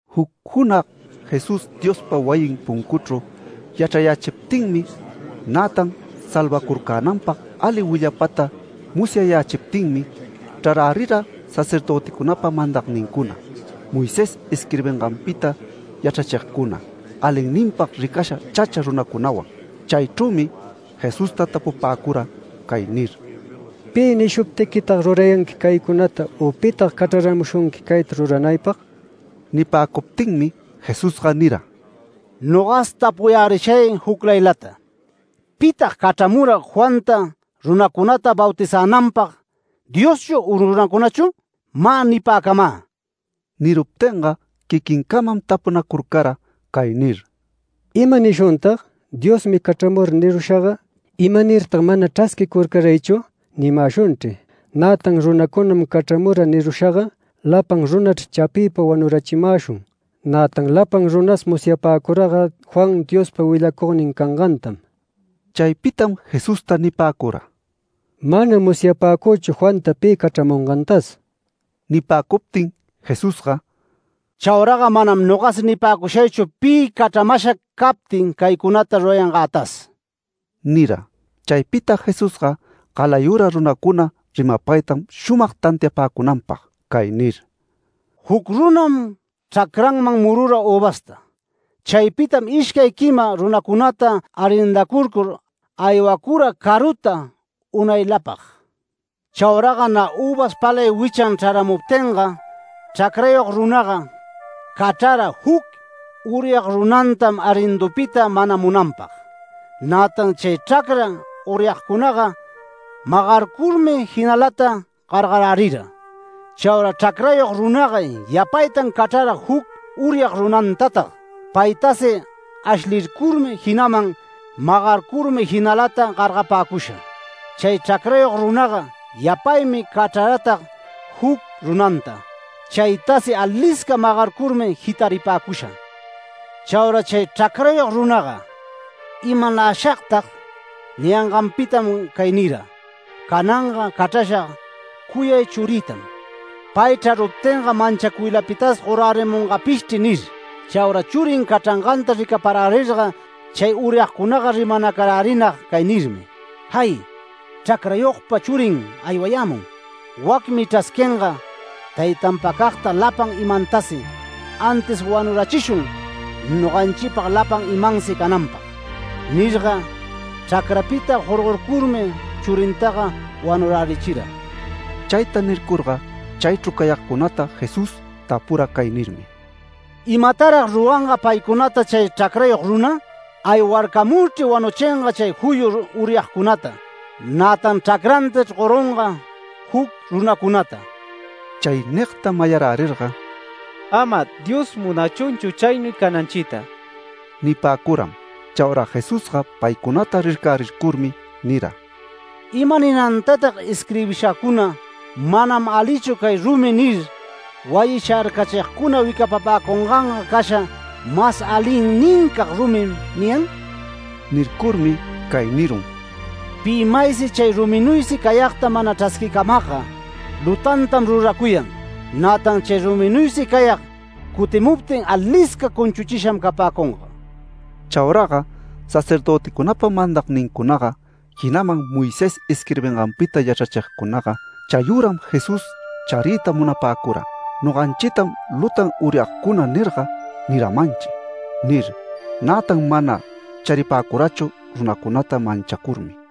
Juc junag Jesús Diospa wayin puncuchru yachrayächiptinmi, nätan salvacurcänanpag ali willapata musyayächiptinmi chrarärira sacerdöticunapa mandagnincuna, Moisés isquirbinganpita yachrachigcuna, alinninpag ricasha chacha runacunawan. Chaychrümi Jesusta tapupäcura cay nir: “¿Pi nishuptiquitag rurayanqui caycunata u pitag cachraramushunqui cayta ruranaypag?” Nipäcuptinmi Jesusga nira: “Nogas tapuyärishay juclaylata. ¿Pitag cachramura Juanta runacunata bautizänanpag, Dioschu u runacunachu? Mä nipäcamä”. Niruptinga quiquincamam tapunacurcara cay nir: “¿Ima nishuntag? ‘Diosmi cachramura’ nirushaga, ‘¿Imanirtag mana chrasquicurcaraychu?’ nimäshunchri. Nätan ‘Runacunam cachramura’ nirushaga, lapan runachr chapiypa wanurachimäshun. Nätan lapan runas musyapäcuraga Juan Diospa willacugnin cangantam”. Chaypitam Jesusta nipäcura: “Manam musyapäcüchu Juanta pi cachramungantas”. Nipäcuptin Jesusga “Chauraga manam nogasi nipäcushaychu, pi cachramasha captin caycunata rurayangätas” nira. Chaypita Jesusga galayura runacuna rimapaytam shumag tantiapäcunanpag cay nir: “Juc runam chracranman murura üvasta. Chaypitam ishcay quima runacunata arrendacurcur, aywacura caruta unaylapag. Chauraga nä üvas palay wichan chraramuptinga chracrayog runaga cachrara juc uryag runantam arrindupita manamunanpag. Nätan chay chracra uryagcunaga magarcurmi jinalata gargarirärira. Chaura chracrayog runaga yapaytan cachrara juc uryag runantatag. Paytasi ashlircurmi, jinaman magarcurmi jinalata gargapäcusha. Chay chracrayog runaga yapaymi cachraratag juc runanta. Chaytasi alisca magarcurmi jitaripäcusha. Chaura chay chracrayog runaga: ‘¿Imanäshagtag?’ Niyanganpitam cay nira: ‘Cananga cachrashag cuyay churïtam. Pay chraruptinga manchacuylapitas gorärimungapishchri’ nir. Chaura churin cachranganta ricaparärirga chay uryagcunaga, rimanacarärinag cay nirmi: ‘¡Jay! Chracrayogpa churin aywayämun. Wacmi chrasquinga taytanpacagta lapan imantasi, antis wanurachishun noganchipag lapan imansi cananpag’. Nirga chracrapita jorgorcurmi churintaga wanurärichira”. Chayta nircurga, chaychru cayagcunata Jesús tapura cay nirmi: “¿Imatarag ruranga paycunata chay chracrayog runa? Aywarcamurchri wanuchinga chay juyu uryagcunata, nätan chracrantachr gorunga juc runacunata”. Chay nigta mayarärirga: “Ama Dios munachunchu chaynuy cananchita” nipäcuram. Chaura Jesusga paycunata rircärircurmi nira: “¿Imaninantatag isquirbishacuna: ‘Manam alichu cay rumi’ nir, wayi sharcachigcuna wicapapäcunganga casha ‘Mas alinnincag rumim’ niyan?” Nircurmi cay nirun: “Pi maysi chay ruminuysi cayagta mana chrasquicamagga, lutantam ruracuyan. Nätan chay ruminuysi cayag cutimuptin alisca cunchuchisham capäcunga”. Chauraga sacerdöticunapa mandagnincunaga, jinaman Moisés isquirbinganpita yachrachigcunaga chayüram Jesús chariyta munapäcura “Noganchitam lutan uryagcuna nirga niramanchi” nir. Nätan mana charipäcurachu runacunata manchacurmi.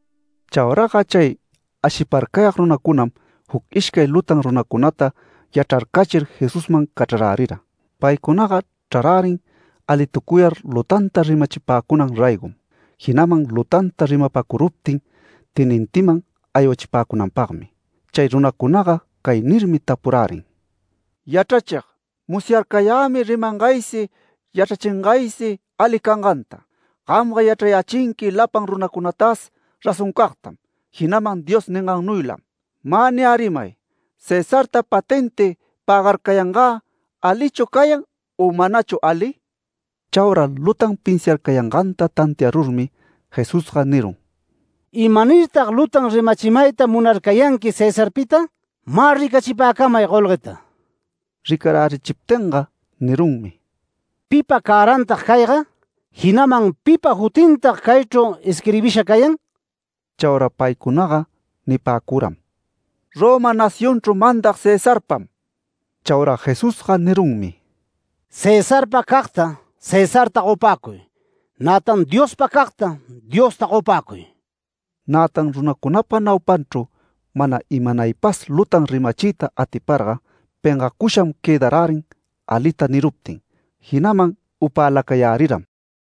Chauraga chay ashiparcayag runacunam juc ishcay lutan runacunata yachrarcachir Jesusman cachrarärira. Paycunaga chrarärin alitucuyar lutanta rimachipäcunan raygom. Jinaman lutanta rimapacuruptin tenintiman aywachipäcunanpagmi. Chay runacunaga cay nirmi tapurärin: “Yachrachig, musyarcayämi rimangaysi, yachrachingaysi ali canganta. Gamga yachrayächinqui lapan runacunatas razoncagtam, jinaman Dios ningannuylam. Mä niyärimay: Cesarta patenti pägarcayangä ¿alichu cayan u manachu ali?” Chaura lutan pinsiarcayanganta tantiarurmi, Jesusga nirun: “¿Imanirtag lutan rimachimayta munarcayanqui Cesarpita? Mä ricachipäcamay golgueta”. Ricarärichiptinga nirunmi: “¿Pipa cärantag cayga? Jinaman ¿pipa jutintag caychru isquirbisha cayan?” Chaura paycunaga nipäcuram: “Roma nacionchru mandag Cesarpam”. Chaura Jesusga nirunmi: “Cesarpa cagta, Cesarta gopäcuy, nätan Diospa cagta, Diosta gopäcuy”. Nätan runacunapa naupanchru mana imanaypas lutan rimachiyta atiparga, pengacusham quëdarärin alita niruptin, jinaman upäläcayäriram.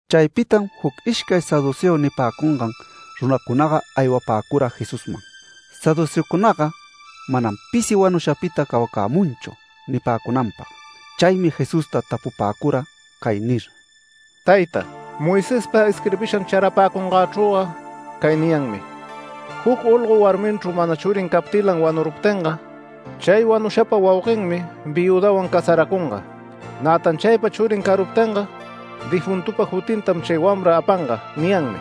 Chaypitam juc ishcay saduceo nipäcungan runacunaga aywapäcura Jesusman. Saduceocunaga “Manam pisi wanushapita cawacämunchu” nipäcunanpag. Chaymi Jesusta tapupäcura cay nir: “Tayta, Moisespa isquirbishan charapäcunganchrüga cay niyanmi: ‘Juc olgo, warminchru mana churin captilan wanuruptinga chay wanushapa wauguenmi viüdanwan casaracunga, nätan chaypa churin caruptinga difuntupa jutintam chay wamra apanga’ niyanmi”.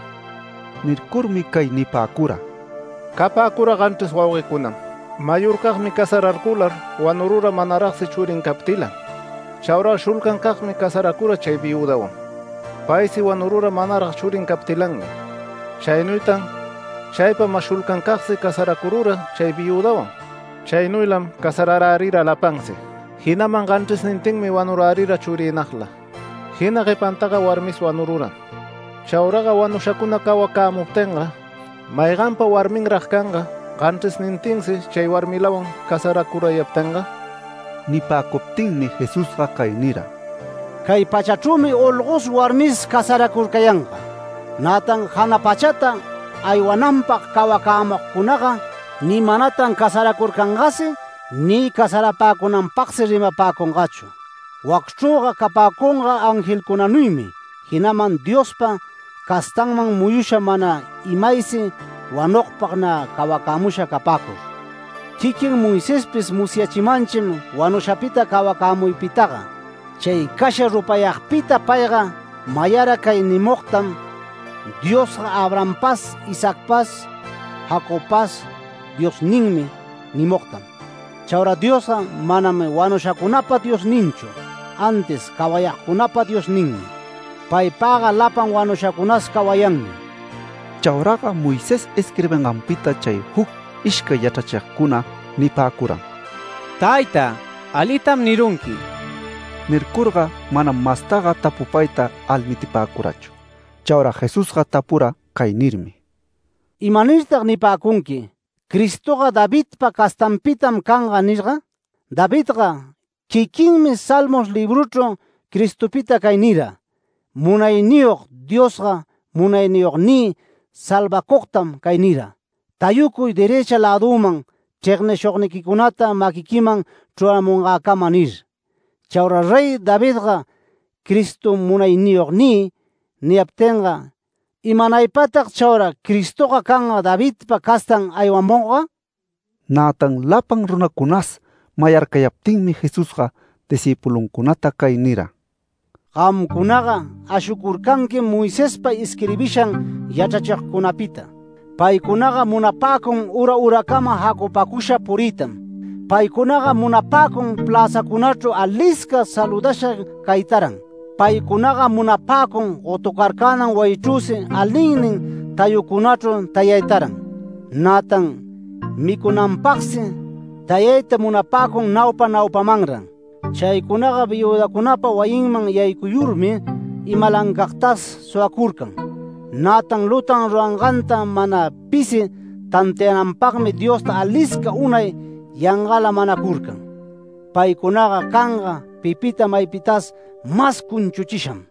Nircurmi cay nipäcura: “Capäcura ganchris wauguecunam. Mayorcagmi casararcular wanurura manaragsi churin captilan. Chauraga shulcancagmi casaracura chay viüdanwan. Paysi wanurura manarag churin captilanmi. Chaynuytan chaypa mas shulcancagsi casaracurura chay viüdanwan. Chaynuylam casararärira lapansi. Jinaman ganchrisnintinmi wanurärira churiynagla. Jina guepantaga warmis wanururam. Chauraga wanushacuna cawacämuptinga, ¿mayganpa warminrag canga ganchrisnintinsi chay warmilawan casaracurayaptinga?” Nipäcuptinmi Jesusga cay nira: “Cay pachachrümi olgos warmis casaracurcayanga. Nätan jana pachata aywananpag cawacämugcunaga ni manatan casaracurcangasi ni casarapäcunanpagsi rimapäcungachu. Wacchrüga capäcunga angelcunanuymi, jinaman Diospa castanman muyusham mana imaysi wanugpag nä cawacämusha capäcur. Quiquin Moisespis musyachimanchim wanushapita cawacämuypitaga. Chay casha rupayagpita payga mayara cay nimugtam ‘Diosga Abrahampas Isaacpas Jacobpas Diosninmi’ nimugtam. Chaura Diosga manam wanushacunapa Diosninchu, antis cawayagcunapa Diosninmi. Paypagga lapan wanushacunas cawayanmi”. Chauraga Moisés isquirbinganpita chay juc ishcay yachrachigcuna nipäcuram: “Tayta, alitam nirunqui”. Nircurga manam mastaga tapupayta almitipäcurachu. Chaura Jesusga tapura cay nirmi: “¿Imanirtag nipäcunqui: ‘Cristoga Davidpa castanpitam canga’ nirga? Davidga quiquinmi Salmos libruchru Cristopita cay nira: ‘Munayniyog Diosga munayniyognï salvacugtam cay nira: “Tayucuy derëcha lädüman chregnishugniquicunata maquiquiman chruramungäcama” nir’. Chaura Rey Davidga Cristota ‘Munayniyognï’ niyaptinga, ¿imanaypatag chaura Cristoga canga Davidpa castan aywamugga?” Nätan lapan runacunas mayarcayaptinmi Jesusga discïpuluncunata cay nira: “Gamcunaga ashucurcanquim Moisespa isquirbishan yachrachigcunapita. Paycunaga munapäcun ura uracama jacupäcusha puriytam. Paycunaga munapäcun pläzacunachru alisca saludasha caytaran. Paycunaga munapäcun gotucurcänan wayichrüsi alinnin tayucunachru tayaytaran. Nätan micunanpagsi tayayta munapäcun naupa naupamanran. Chaycunaga viüdacunapa wayinman yaycuyurmi imalancagtas suwacurcan, nätan lutan ruranganta mana pisi tantiananpagmi Diosta alisca unay yangala manacurcan. Paycunaga canga pipita maypitas mas cunchuchisham”.